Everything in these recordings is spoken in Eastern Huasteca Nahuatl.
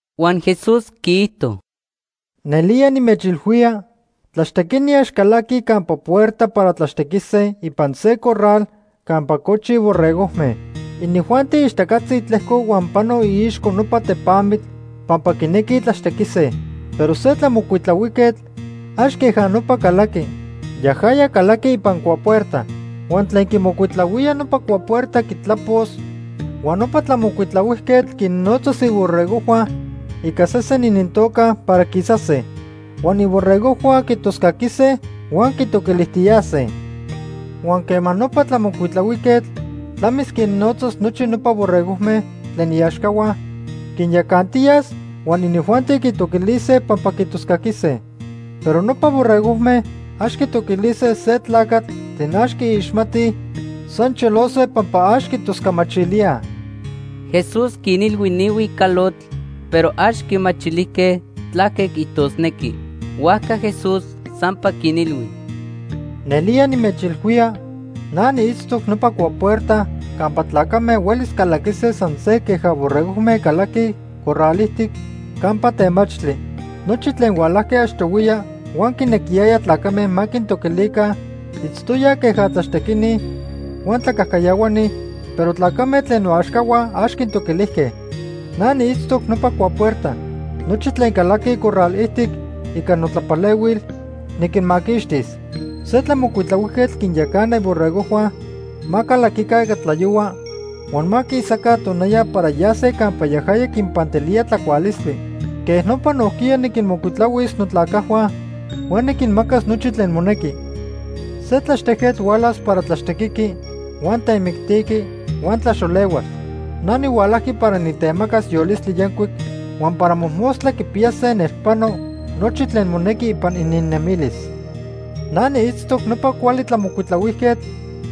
Huan Jesús quiijto: “Nelía nimechilhuía, tlaxtequini ax calaquij campa puerta para tlaxtequise ipan se corral campa cochi borregojme. Inijuanti ixtacatzi tlejcoj huan panoj iixco nopa tepamitl pampa quinequij tlaxtequise. Pero se tlamocuitlahuijquetl ax queja nopa calaqui. Yajaya calaqui ipan cuapuerta. Huan tlen quimocuitlahuía nopa cuapuerta quitlapos, huan nopa tlamocuitlahuijquetl quinnotzas iborregojhua ica sesen inintoca para quisase. Huan iborregojhua quitoscaquise huan quitoquilijtiyase. Huan quema nopa tlamocuitlahuijquetl tlamis quinnotzas nochi nopa borregojme tlen iaxcahua, quinyacantiyas huan inijuanti quitoquilise pampa quitoscaquise. Pero nopa borregojme ax quitoquilise se tlacatl tlen ax quiixmatij, san cholose pampa ax quitoscamachilíaj.” Jesús quinilhui ni huicalotl pero ax quimachilijque tlaque quiijtosnequi. Huajca Jesús sampa quinilhui: “Nelía nimechilhuía na niitztoc nopa cuapuerta campa tlacame huelis calaquise san se queja borregojme calaquij corral ijtic campa temachtli. Nochi tlen hualajque achtohuiya huan quinequiyayaj tlacame ma quintoquilica itztoyaj queja tlaxtequini huan tlacajcayahuani, pero tlacame tlen noaxcahua ax quintoquilijque. Na niitztoc nopa cuapuerta. Nochi tlen calaquij corral ijtic ica notlapalehuil, niquinmaquixtis. Se tlamocuitlahuijquetl quinyacana iborregojhua ma calaquica ica tlayohua huan ma quisaca tonaya para yase campa yajaya quinpantilía tlacualistli. Quej nopa nojquiya niquinmocuitlahuis notlacajhua huan niquinmacas nochi tlen monequi. “Se tlaxtejquetl hualas para tlaxtequiqui huan temictiqui huan tlaxolehuas. Na nihualajqui para nitemacas yolistli yancuic huan para mojmostla quipiyase nelpano nochi tlen monequi ipan ininnemilis. Na niitztoc nopa cuali tlamocuitlahuijquetl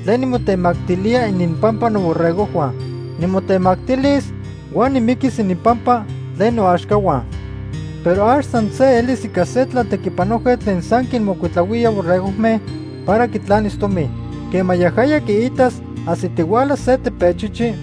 tlen nimotemactilía ininpampa noborregojhua. Nimotemactilis huan nimiquis ininpampa tlen noaxcahua. Pero ax san se elis ica se tlatequipanojquetl tlen san quinmocuitlahuía borregojme para quitlanis tomi. Quema yajaya quiitas ajsitihuala se tepechichi,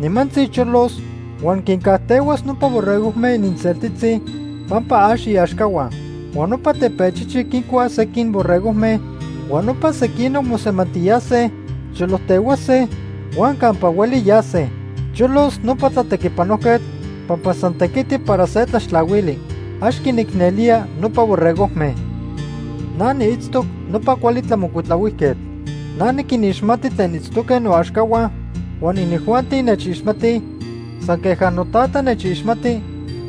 nimantzi cholos huan quincajtehuas nopa borregojme ininseltitzi pampa ax iaxcahua. Huan nopa tepechichi quincuas sequin borregojme huan nopa sequinoc mosemantiyase, cholojtehuase huan campa hueli yase. Cholos nopa tlatequipanojquetl pampa san tequiti para se tlaxtlahuili. Ax quinicnelía nopa borregojme. “Na niitztoc nopa cuali tlamocuitlahuijquetl. Na niquinixmati tlen itztoque noaxcahua huan inijuanti nechixmatij, san queja noTata nechixmati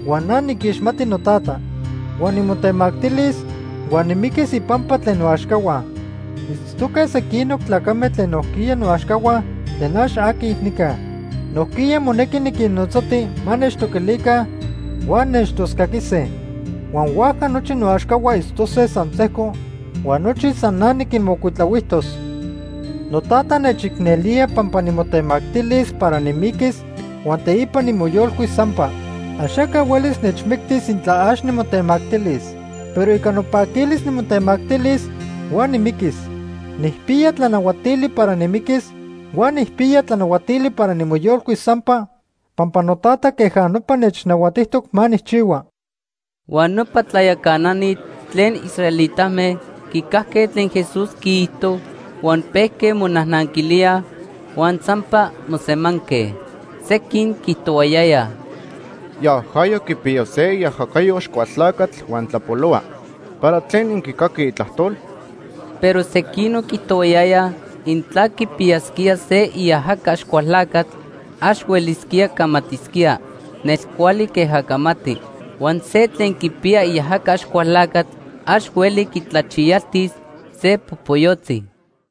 huan na niquixmati noTata. Huan nimotemactilis huan nimiquis ipampa tlen noaxcahua. Itztoque sequinoc tlacame tlen nojquiya noaxcahua tlen ax aquij nica. Nojquiya monequi niquinnotzati ma nechtoquilica huan nechtoscaquise. Huan huajca nochi noaxcahua itztose san sejco huan nochi san na niquinmocuitlahuijtos. “NoTata nechicnelía pampa nimotemactilis para nimiquis huan teipa nimoyolcuis sampa. Axaca huelis nechmictis intla ax nimotemactilis. Pero ica nopaquilis nimotemactilis huan nimiquis. Nijpiya tlanahuatili para nimiquis huan nijpiya tlanahuatili para nimoyolcuis sampa pampa noTata queja nopa nechnahuatijtoc ma nijchihua.” Huan nopa tlayacanani tlen israelitame quicajque tlen Jesús quiijto huan pejque monajnanquilíaj huan sampa mosemanque. Sequin quiijtohuayayaj: ―Yajaya quipiya se iajacayo Axcualtlacatl huan tlapolohua. ¿Para tlen inquicaquij itlajtol? Pero sequinoc quiijtohuayayaj intla quipiyasquía se iajaca Axcualtlacatl ax huelisquía camatisquía nelcuali queja camati. Huan se tlen quipiya iajaca Axcualtlacatl ax hueli quitlachiyaltis se popoyotzi.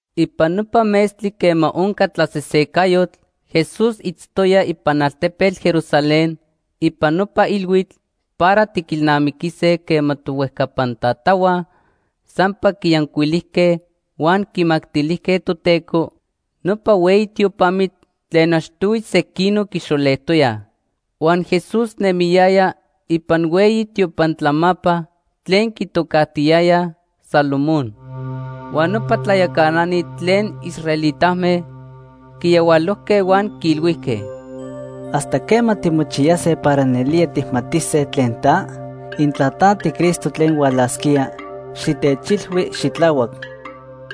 Ipan nopa metztli quema onca tlasesecayotl, Jesús itztoya ipan altepetl Jerusalén ipan nopa ilhuitl para tiquilnamiquise quema tohuejcapan tatahua sampa quiyancuilijque huan quimactilijque Toteco nopa hueyi tiopamitl tlen achtohui sequinoc quixolejtoyaj. Huan Jesús nemiyaya ipan hueyi tiopan tlamapa tlen quitocajtiyayaj Salomón. Huan nopa tlayacanani tlen israelitame quiyahualojque huan quiilhuijque: ―¿Hasta quema timochiyase para nelía tijmatise tlen ta? Intla ta tiCristo tlen hualasquía, xitechilhui xitlahuac.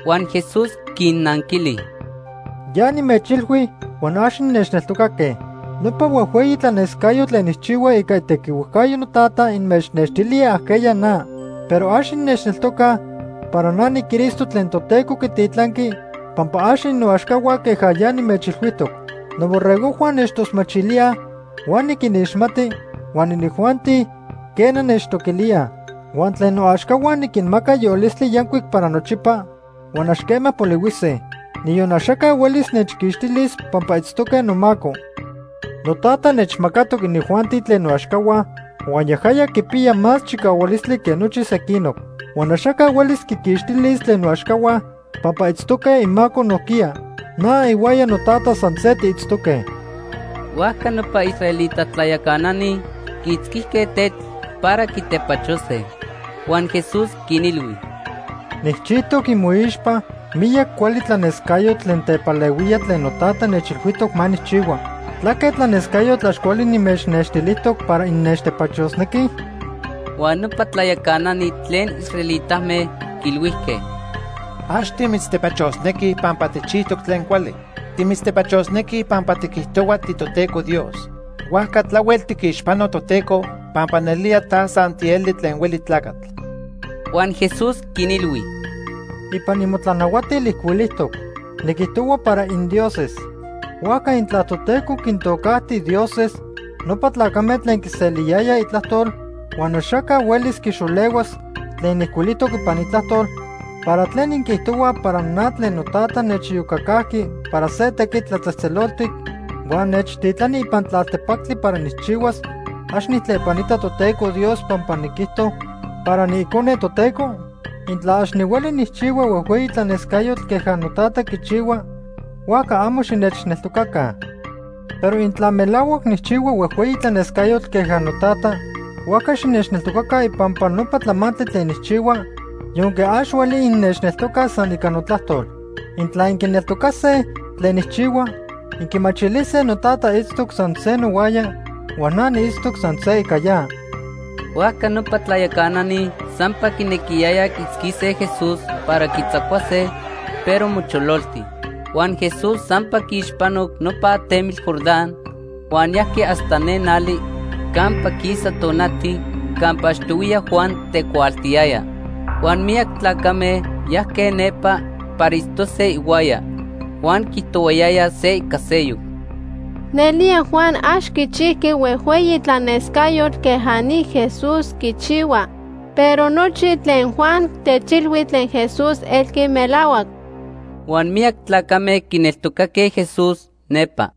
Huan Jesús quinnanquili: ―Ya nimechilhui huan ax innechneltocaque. Nopa huejhueyi tlanescayotl tlen nijchihua ica itequiticayo noTata inmechnextilía ajqueya na. Pero ax innechneltocaj para na niCristo tlen Toteco quititlanqui pampa ax innoaxcahua queja ya nimechilhuijtoc. Noborregojhua nechtosmachilíaj huan niquinixmati huan inijuanti, quena, nechtoquilíaj. Huan tlen noaxcahua niquinmaca yolistli yancuic para nochipa huan ax quema polihuise; niyon axaca huelis nechquixtilis pampa itztoque nomaco. NoTata nechmacatoc inijuanti tlen noaxcahua huan yajaya quipiya más chicahualistli que nochi sequinoc. Huan axaca huelis quiquixtilis tlen noaxcahua pampa itztoque imaco nojquiya. Na ihuaya noTata san se tiitztoque. Huajca nopa israelita tlayacanani quiitzquijque tetl para quitepachose. Huan Jesús quinilhui: ―Nijchijtoc imoixpa miyac cuali tlanescayotl tlen tepalehuía tlen noTata nechilhuijtoc ma nijchihua. ¿Tlaque tlanescayotl ax cuali nimechnextilijtoc para innechtepachosnequij? Huan nopa tlayacanani tlen israelitame quiilhuijque: ―Ax timitztepachosnequij pampa tijchijtoc tlen cuali. Timitztepachosnequij pampa tiquijtohua tiToteco Dios. Huajca tlahuel tiquixpano Toteco pampa nelía ta san tieli tlen hueli tlacatl. Huan Jesús quinilhui: ―Ipan imotlanahuatil ijcuilijtoc: ‘Niquijtohua para indioses.’ Huajca intla Toteco quintocajti ‘dioses’ nopa tlacame tlen quiseliyayaj itlajtol huan axaca huelis quixolehuas tlen ijcuilijtoc ipan Itlajtol, ¿para tlen inquiijtohuaj para na tlen noTata nechiyocacajqui para se tequitl tlatzejtzeloltic, huan nechtitlani ipan tlaltepactli para nijchihuas, ax nijtlepanita Toteco Dios pampa niquijto para niIcone Toteco? Intla ax nihueli nijchihua huejhueyi tlanescayotl queja noTata quichihua, huajca amo xinechneltocaca. Pero intla melahuac nijchihua huejhueyi tlanescayotl queja noTata, huajca xinechneltocaca ipampa nopa tlamantli tlen nijchihua yonque ax hueli innechneltocaj san ica notlajtol. Intla inquineltocase tlen nijchihua, inquimachilise noTata itztoc san se nohuaya huan na niitztoc san se ica ya. Huajca nopa tlayacanani sampa quinequiyayaj quiitzquise Jesús para quitzacuase, pero mochololti. Huan Jesús sampa quiixpanoc nopa atemitl Jordán huan yajqui hasta ne nali campa quisa tonati campa achtohuiya Juan tecuaaltiyaya. Huan miyac tlacame yajque nepa para itztose ihuaya. Huan quiijtohuayayaj se ica seyoc: ―Nelía Juan ax quichijqui huejhueyi tlanescayotl queja ni Jesús quichihua, pero nochi tlen Juan techilhui tlen Jesús elqui melahuac. Huan miyac tlacame quineltocaque Jesús nepa.